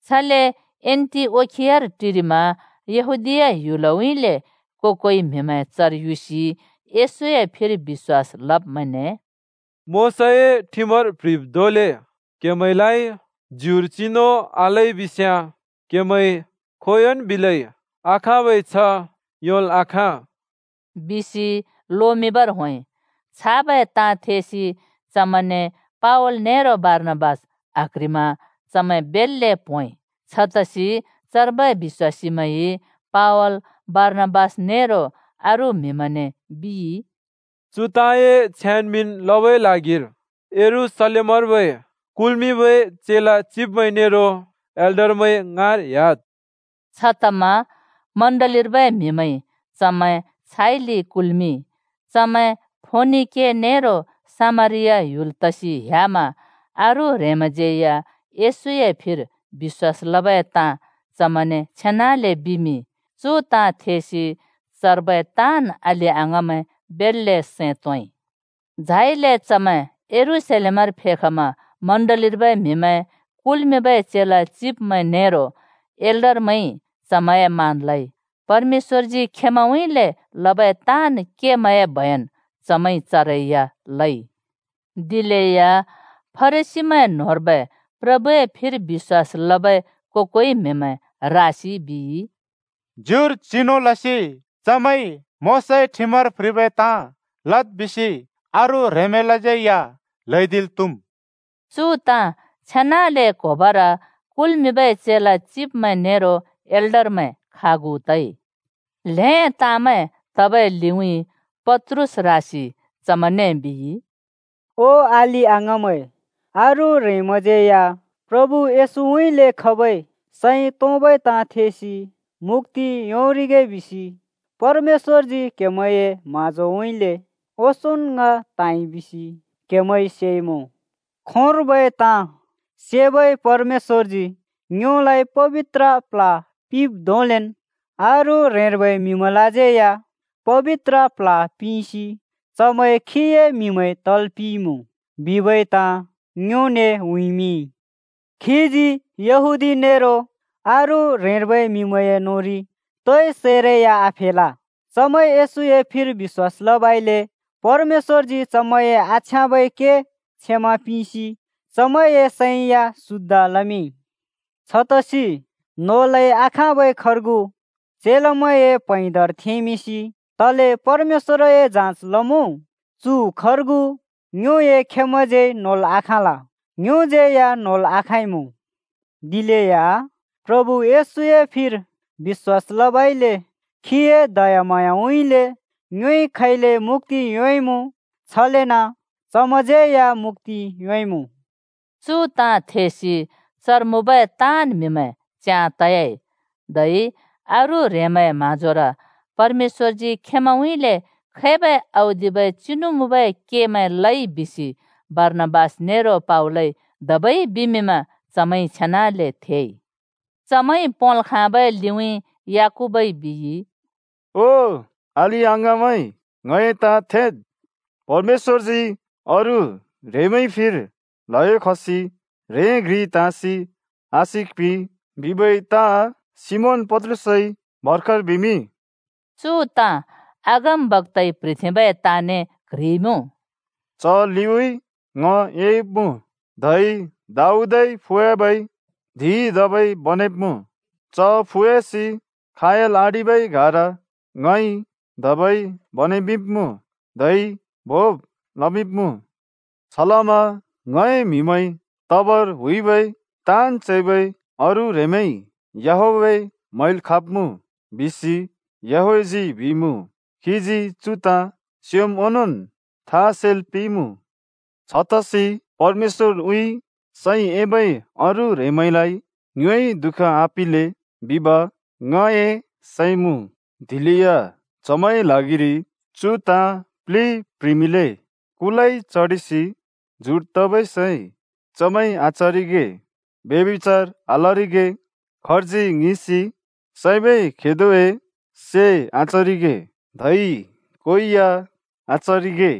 छले एन्टिओखियार टिरिमा यहूदीया ह्‍युलउँइँले को-कोइ म्हिमैं चर युसि येशूए फिर बिश्‍वासीमैंने, “मोशाए ठिमर प्ह्रिब् धोंले क्हमैंलाइ ज्युर चिनु आललै बिस्याँ क्हेमैंइ खोंयोंन् बिलै आखाँबै छ्ह योंल् आखाँ,” बिसि लोमिंबर होंइ। छाबै ताँ थेसि चमैंने पावल नेरो बारनाबास आक्ह्रिमा चमैं बेल्‍ले प्होंइ। छतसि चर्बै बिश्‍वासीमैंइ पावल, बारनाबास नेरो अरू म्हिमैंने बिइ, “चु ताँए छ्याँन् मिंन् लबै ल्हागिर यरूशलेमर्बै कुल्मिंबै चेला चिब्मैं नेरो एल्डरमैं ङाँर ह्‍याद्।” छतमा चर्चर्बै म्हिमैंइ चमैं छाइले बिदा लसि कुल्मिंइ। चमैं फोनिके नेरो सामरिया ह्‍युल तसि ह्‍यामा अरू ह्रेंमैंज्यै या येशूए फिर बिश्‍वास लबै ताँ चमैंने छेनाले बिमिंइ। चु ताँ थेसि चर्बै ताँन् अलि-अङाँमैं बेल्‍ले सैं तोंइ। झाइले चमैं यरूशलेमर फेखमा चर्चर्बै म्हिमैं, कुल्मिंबै चेला चिब्मैं नेरो एल्डरमैंइ चमैंए मान लइ। परमेश्‍वरजी खेंमैंउँइँले लबै ताँन् केमैंए बयन चमैंइ चरै या लइ। दिलेया फरिसीमैं न्होंर्बै प्रभुए फिर बिश्‍वास लबै को-कोइ म्हिमैं रासि बिइ, “ज्युर चिनु लसि चमैंइ मोशाए ठिमर प्ह्रिबै ताँ लद् बिसि अरू ह्रेंमैंलाज्यै या ल्‍हैदिल् त्‍हुम्।” चु ताँ छेनाले क्होबर कुल्मिंबै चेला चिब्मैं नेरो एल्डरमैं खागु तइ। ल्‍हें ताँमैं तबै लिउँइँ पत्रुस रासि चमैंने बिइ, “ओ अलि-अङाँमैं, अरू ह्रेंमैंज्यै या प्रभु येशूउँइँले खबै सैं तोंबै ताँ थेसि मुक्‍ति योंरिगे बिसि परमेश्‍वरजी क्हेमैंए म्हाँजोउँइँले ओंसोंन् ङ त्हाँइ बिसि क्हेमैंइ सेइमुँ। खोंर्बै ताँ सेबै परमेश्‍वरजी ङ्योलाइ पबित्र प्ल्ह पिंब् धोंलेन् अरू ह्रेंर्बै म्हिमैंलाज्यै या पबित्र प्ल्ह पिंसि चमैं खीए म्हिमैं तल् पिंइमुँ बिबै ताँ ङ्योने उँइँमिंइ। खीजी यहूदी नेरो अरू ह्रेंर्बै म्हिमैंए न्होंरि तोइ सैरै या आफेल। चमैंइ येशूए फिर बिश्‍वास लबइले परमेश्‍वरजी चमैंए आछ्याँबै के क्षमा पिंसि चमैंए सैं या शुद्ध लमिंइ। छतसि नोलै आखाँबै खर्गु चेलामैंए प्हैंदार थेंमिंसि तले परमेश्‍वरए जाँच लमुँ? चु खर्गु ङ्योए खेमैंज्यै नोल् आखाँल, ङ्योज्यै या नोल् आखाँइमुँ। दिलेया प्रभु येशूए फिर बिश्‍वास लबइले खीए दयाम्हाँयाउँइँले ङ्योइ खैले मुक्‍ति योंइमुँ, छलेन चमैंज्यै या मुक्‍ति योंइमुँ।” चु ताँ थेसि चर मुँबै ताँन् म्हिमैं च्याँ तयाइ, धै अरू ह्रेंमैंए म्हाँजोर परमेश्‍वरजी खेंमैंउँइँले खैबै औदिबै चिनु मुँबै केमैं लइ बिसि बारनाबास नेरो पावलइ धबै बिमिंमा चमैंइ छेनाले थेइ। चमैंइ पोंल् खाँबै लिउँइँ याकूबइ बिइ, “ओ अलि-अङाँमैं, ङए ताँ थेद्।” परमेश्‍वरजी अरू ह्रेंमैंए फिर ल्हयो खसि ह्रें घ्रि त्हाँसि आशिक पिंइ बिबै ताँ सिमोन पत्रुसइ भर्खर बिमिंइ। चु ताँ अगमबक्‍ताइ प्ह्रिथेंबै ताँने क्ह्रिइमुँ, “‘च लिउँइँ ङ एयुब्मुँ, धै दाऊदए फुयाबै धिं धबै बनेब्‍मुँ। चए फुयासि खयाल आडिबै गाह्रा ङइ धबै बनेमिंब्‍मुँ, धै भोंब् लमिंब्मुँ। छलमा ङए म्हिमैं तबर हुइबै ताँन् चैबै अरू ह्रेंमैंइ, याहवेह म्हैल् खाँब्मुँ, बिसि याहवेहजी बिइमुँ। खीजी चु ताँ स्योंम् ओंनोंन् था सेल् पिंइँमुँ।’ “छतसि परमेश्‍वरउँइँ सैं एबै अरू ह्रेंमैंलाइ ङ्योइ दुःख आपिंले बिब ङए सैं मुँ, दिलेया चमैंए ल्हागिरि चु ताँ प्लि प्ह्रिमिंले: कुलाइ चडिसि जुट् तबै सै चमैंइ आचरिगे, ब्यभिचार आलरिगे, खर्जी ङिसि सैबै खेदोए से आचरिगे, धै को या आचरिगे।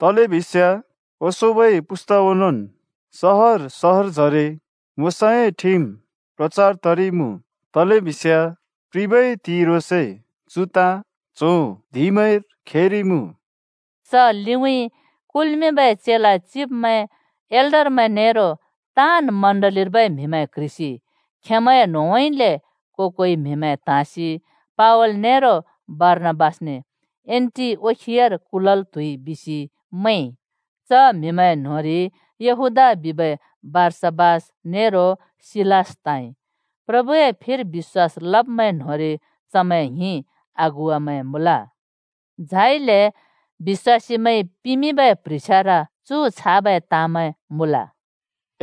तलेबिस्याँ ओंसोंबै पुस्ता ओनोंन् सहर सहरजरे मोशाए ठिम प्रचार तरिइमुँ, तलेबिस्याँ प्रिबै त्हिंइ ह्रोंसे चु ताँ च्हों धिंमैंर खेरिइमुँ।” च लिउँइँ कुल्मिंबै चेला चिब्मैं, एल्डरमैं नेरो ताँन् चर्चर्बै म्हिमैं क्ह्रिसि खेंमैंए न्होंउँइँले को-कोइ म्हिमैं त्हाँसि पावल नेरो बारनाबासने एन्‍टिओखियार कुलल् त्हुइ बिसि मैंइ, च म्हिमैं न्होंरि यहूदा बिबै बारसाबास नेरो सिलास त्हाँइ। प्रभुए फिर बिश्‍वास लब्मैं न्होंरि चमैं ङ्हिं अगुवामैं मुँल। झाइले बिश्‍वासीमैंइ पिमिंबै प्ह्रिछ्यार चु छाबै ताँमैं मुँल: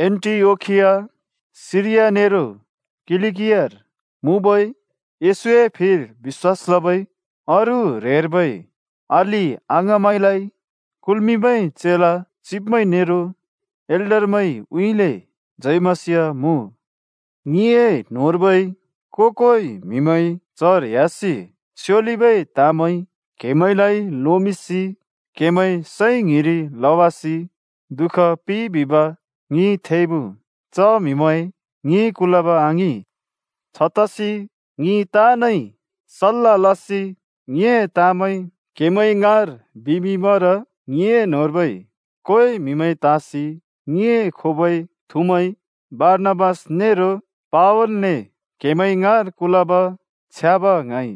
“एन्‍टिओखिया, सिरिया नेरो किलिकियार मुँबै येशूए फिर बिश्‍वास लबै अरू ह्रेंर्बै अलि-अङाँमैंलाइ कुल्मिंबै चेला चिब्मैं नेरो एल्डरमैंउँइँले जय मसीह मुँ। ङिए न्होंर्बै को-कोइ म्हिमैं चर ह्‍यासि स्योलिबै ताँमैं क्हेमैंलाइ लोमिंसि क्हेमैंए सैं ङ्हिरि लवासि दुःख पिंइ बिब ङिइ थेइमुँ। च म्हिमैं ङिंइ कुलब आङिं। छतसि ङि ताँनइ सल्‍ला लसि ङिंए ताँमैं क्हेमैं ङाँर बिमिंबर ङिए न्होंर्बै कोइ म्हिमैं त्हाँसि ङिए खोबै थुमैं बारनाबास नेरो पावलने क्हेमैं ङाँर कुलब छ्याँब ङ्हाँइ।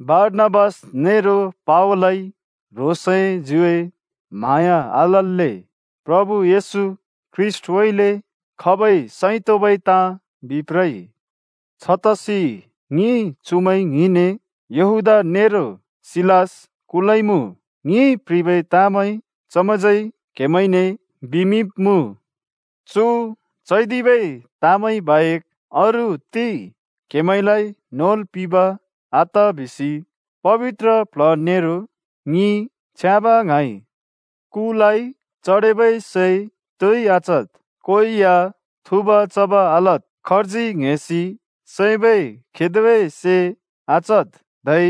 बारनाबास नेरो पावलइ ह्रोंसए ज्युए म्हाँया आलल्‍ले प्रभु येशू ख्रीष्‍टउँइँले खबै सैं तोंबै ताँ बिप्रइ। छतसि ङिइ चुमैं ङ्हिंने यहूदा नेरो सिलास कुलइमुँ, ङिंइ प्ह्रिबै ताँमैं चमैंज्यै क्हेमैंने बिमिंब्मुँ। चु चैदिबै ताँमैं बाहेक अरू ति क्हेमैंलाइ नोल् पिंब आत बिसि पबित्र प्ल्ह नेरो ङिइ छ्याँब ङ्हाँइ: कुलाइ चडेबै सै तोइ आचद्, को या थुँब-चब् आलद्, खर्जी ङ्हेसि सैबै खेदोए से आचद्, धै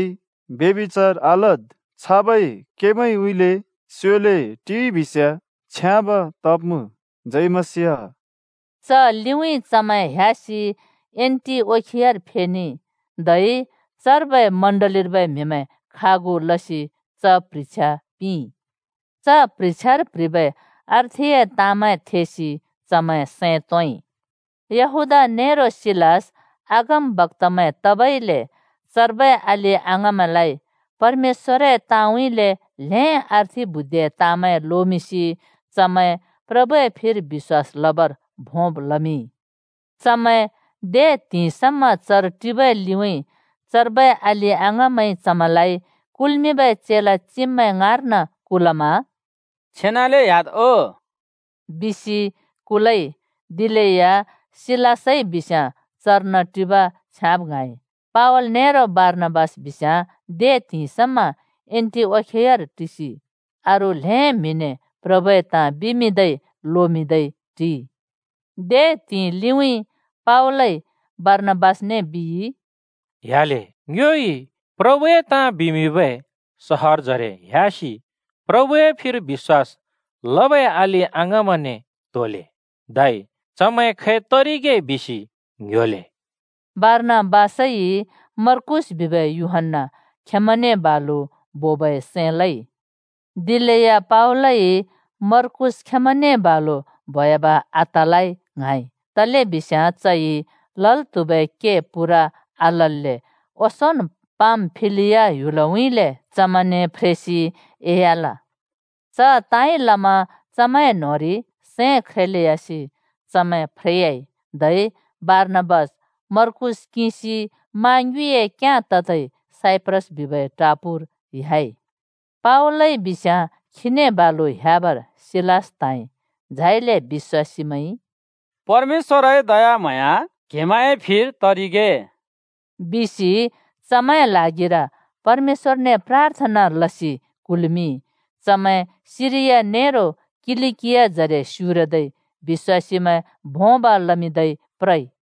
ब्यभिचार आलद्। छाबै केमैंउँइँले स्योले टिइ बिस्याँ छ्याँब तब्मुँ। जय मसीह।” च लिउँइँ चमैं ह्‍यासि एन्‍टिओखियार फेनेइ, धै चर्बै चर्चर्बै म्हिमैं खागु लसि च प्ह्रिछ्या पिंइ। प्ह्रिछ्यार प्ह्रिबै अर्थिए ताँमैं थेसि चमैं सैं तोंइ। यहूदा नेरो सिलास अगमबक्‍तामैं तबइले चर्बै अलि-अङाँमैंलाइ परमेश्‍वरए ताँउँइँले ल्हें अर्थि बुद्धिए ताँमैं लोमिंसि चमैं प्रभुए फिर बिश्‍वास लबर भोंब् लमिंइ। चमैं दे त्हिंइ समा चर टिबै लिउँइँ चर्बै अलि-अङाँमैंइ चमैंलाइ कुल्मिंबै चेला चिब्मैं ङाँर्न कुलमा “छेनाले ह्‍याद् ओ!” बिसि बिदा लइ। [दिलेया सिलासइ बिस्याँ चर्न टिब छ्याँब ङ्हाँइ।] पावल नेरो बारनाबास बिस्याँ दे त्हिंइ समा एन्टिओखियार टिसि अरू ल्हें म्हिने प्रभुए ताँ बिमिंदै लोमिंदै टिइ। दे त्हिंइ लिउँइँ पावलइ बारनाबासने बिइ, “ह्‍याले, ङ्योइ प्रभुए ताँ बिमिंबै सहरजरे ह‍यासि प्रभुए फिर बिश्‍वास लबै अलि-अङाँमैंने त्होले, धै चमैं खै तरिगे बिसि ङ्‍ह्‍योले।” बारनाबासइ मर्कूस बिबै यूहन्‍ना खेंमैंने बालु बोबै सैं लइ। दिलेया पावलइ मर्कूस खेंमैंने बालु बोयाब आतलै ङ्हाँइ, तलेबिस्याँ चइ लल् त्हुबै के पूरा आलल्‍ले ओंसोंन् पामफिलिया ह्‍युलउँइँले चमैंने फ्रेसि एह्‍याल। च ताँइ लमा चमैं न्होंरि सैं ख्रेलेयासि चमैं फ्रेयाइ। धै बारनाबास मर्कूस किंसि मा ङ्युँइए क्याँ ततै साइप्रस बिबै टापूर ह्‍याइ। पावलइ बिस्याँ खीने बालु ह्‍याबर सिलास त्हाँइ। झाइले बिश्‍वासीमैंइ “परमेश्‍वरए दयाम्हाँया क्हेमैंए फिर तरिगे!” बिसि चमैंलाइ पर्मेश्‍वरए योर पिंसि बिदा पिंइ। चमैं सिरिया नेरो किलिकियाजरे स्युरदै बिश्‍वासीमैं भोंब् लमिंदै प्रइ।